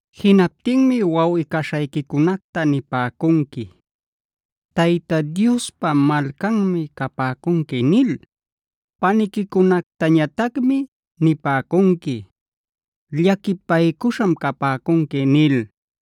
Jinaptinmi wawꞌi-caśhayquicunacta nipäcunqui: “Tayta Diospa malcanmi capäcunqui” nil. Paniquicunactañatacmi nipäcunqui: “Llaquipaycuśham capäcunqui” nil.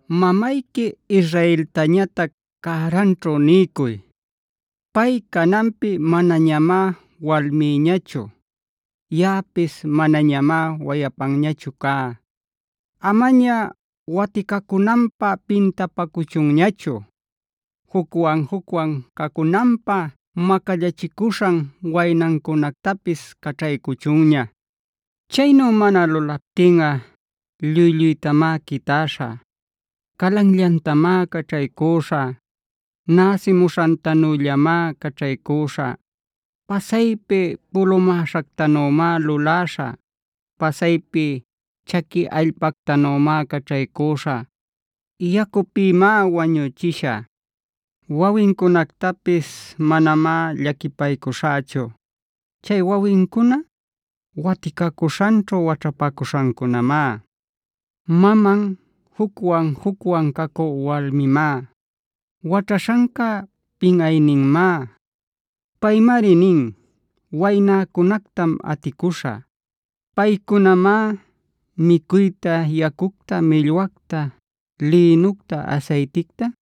Mamayqui Israeltañatac cäranćhu niycuy: “Pay cananpi manañamá walmïñachu; yaꞌapis manañamá wayapanñachu cá. Amaña waticacunanpä pintapacuchunñachu. Jucwan-jucwan cacunanpä macallachicuśhan waynancunactapis caćhaycuchunña. “Chaynu mana lulaptinꞌa lluy-lluytamá quitäśhä. Calanllantamá caćhaycüśhä;a näsimuśhantanüllamá caćhaycüśhä. Pasaypi pulumäśhactanümá luläśhä. Pasaypi chaqui allpactanümá caćhaycüśhä; yacupïmá wañuchishä. Wawincunactapis manamá llaquipaycuśhächu. Chay wawincuna, waticacuśhanćhu waćhapacuśhancunamá. Maman jucwan-jucwan cacü walmimá. Waćhaśhanca pinꞌayninmá. Paymari nin: ‘Waynäcunactam aticuśhä. Paycunamá micuyta, yacucta, millwacta, lïnucta, asayticta,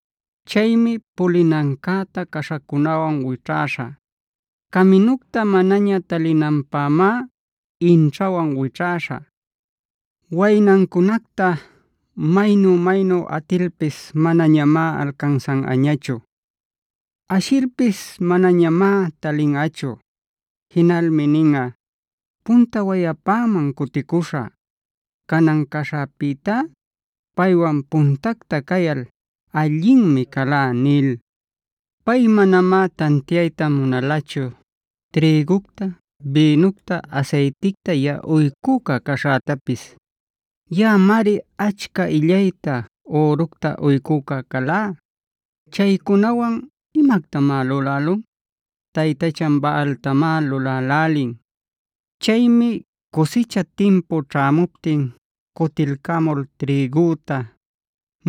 “Chaymi pulinancäta caśhacunawan wićhäśhä. Caminucta manaña talinanpämá inćhawanc wićhäśhä. Waynancunacta maynu-maynu atilpis manañamá alcansanꞌañachu. Ashilpis manañamá talinꞌachu. Jinalmi ninꞌa: ‘Punta wayapäman cuticuśhä. Canan caśhäpïtá, paywan puntacta cayal allinmi calá’ nil. Pay manamá tantiayta munalachu trïgucta, bïnucta, asayticta yaꞌa uycüca caśhätapis. Yaꞌamari achca illayta, üructa uycüca calá. Chaycunawan ¿imactamá lulälun? Taytachan Baaltamá lulälälin. “Chaymi cusicha timpu ćhämuptin cutilcamul trïgüta,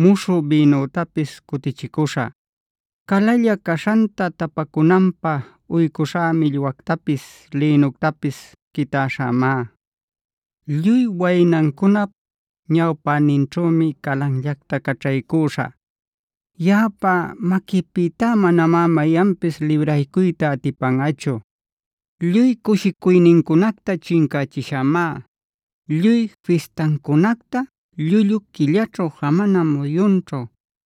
muśhü bïnütapis cutichicuśhä. Calalla caśhanta täpa cunanpä uycuśhá millwätapis, lïnütapis quitäśhämá. Lluy waynancunap ñawpäninćhümi calanllacta caćhaycüśhä. Yaꞌapa maquïpïta manamá mayanpis libraycuyta atipanꞌachu. Lluy cushicuynincunacta chincächishämá. Lluy fistancunacta, llullu quillaćhu, jamana muyunćhu,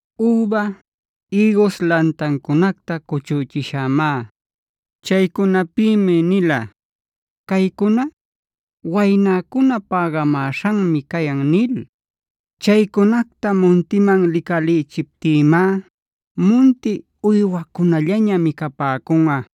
Üba, ïgus lantancunacta cuchüchishämá. Chaycunapïmi nila: ‘Caycuna, waynäcuna pägamäśhanmi cayan’ nil. Chaycunacta muntiman licalïchiptïmá munti uywacunallaña micapäcunꞌa.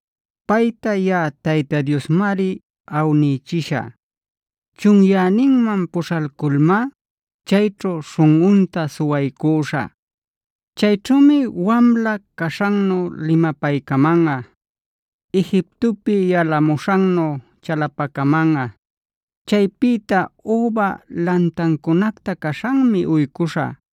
“Payta yaꞌa Tayta Diosmari awnichishä. Chunyäninman puśhalculmá chayćhu śhunꞌunta suwaycuśhä. Chayćhümi wamla caśhannu limapaycamanꞌa; Egiptopi yalamuśhannu chalapacamanꞌa. Chaypïta üba lantancunacta caśhanmi uycuśhä.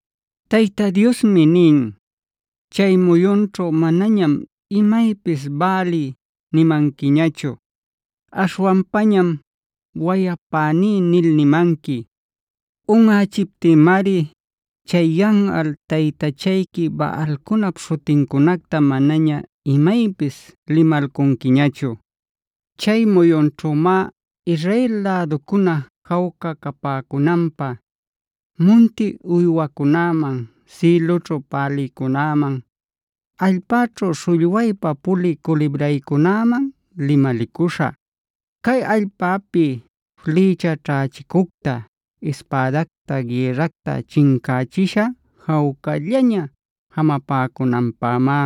Tayta Diosmi nin: “Chay muyunćhu manañam imaypis ‘Baali’g nimanquiñachu, aśhwanpañam ‘Wayapäní’h nil nimanqui. Unꞌächiptïmari chay yanꞌal taytachayqui Baalcunap śhutincunacta manaña imaypis limalcunquiñachu. Chay muyunćhümá Israel läducuna jawca capäcunanpä munti uywacunäman, sïlüćhu pälïcunäman, allpäćhu śhullwaypa pulï culibraycunäman limalicuśhä. Cay allpäpi flïcha ćhächicucta, ispädacta, gïrracta chincächishä jawcallaña jamapäcunanpämá.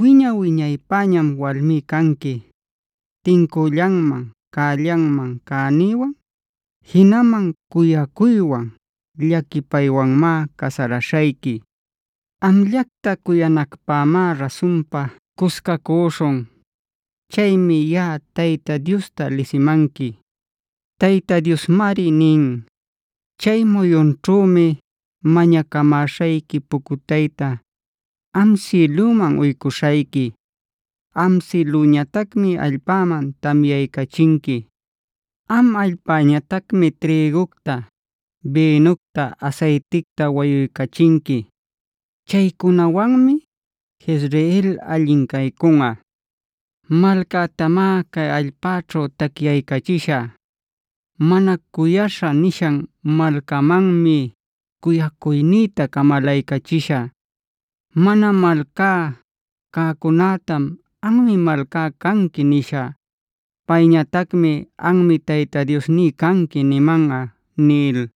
Wiña-wiñaypäñam walmí canqui. Tincüllanman, cällanman cänïwan, jinaman cuyacuywan, llaquipaywanmá casaraśhayqui. Amllacta cuyanacpämá rasunpa cuscacuśhun. Chaymi yaꞌa Tayta Diosta lisimanqui. “Tayta Diosmari nin: chay muyunćhümi mañacamäśhayqui pucutayta, am sïlüman uycuśhayqui; am sïlüñatacmi allpäman tamyaycachinqui. Am allpäñatacmi trïgucta, bïnucta, asayticta wayuycachinqui. Chaycunawanmi Jezreel allin caycunꞌa. Malcätamá cay allpäćhu tacyaycachishä. ‘Mana cuyaśha’i nishan malcamanmi cuyacuynïta camalaycachishä. Mana malcá cäcunätam ‘anmi malcáj canqui’ nishä.k Payñatacmi: ‘Anmi Tayta Diosní canqui’ nimanꞌa” nil.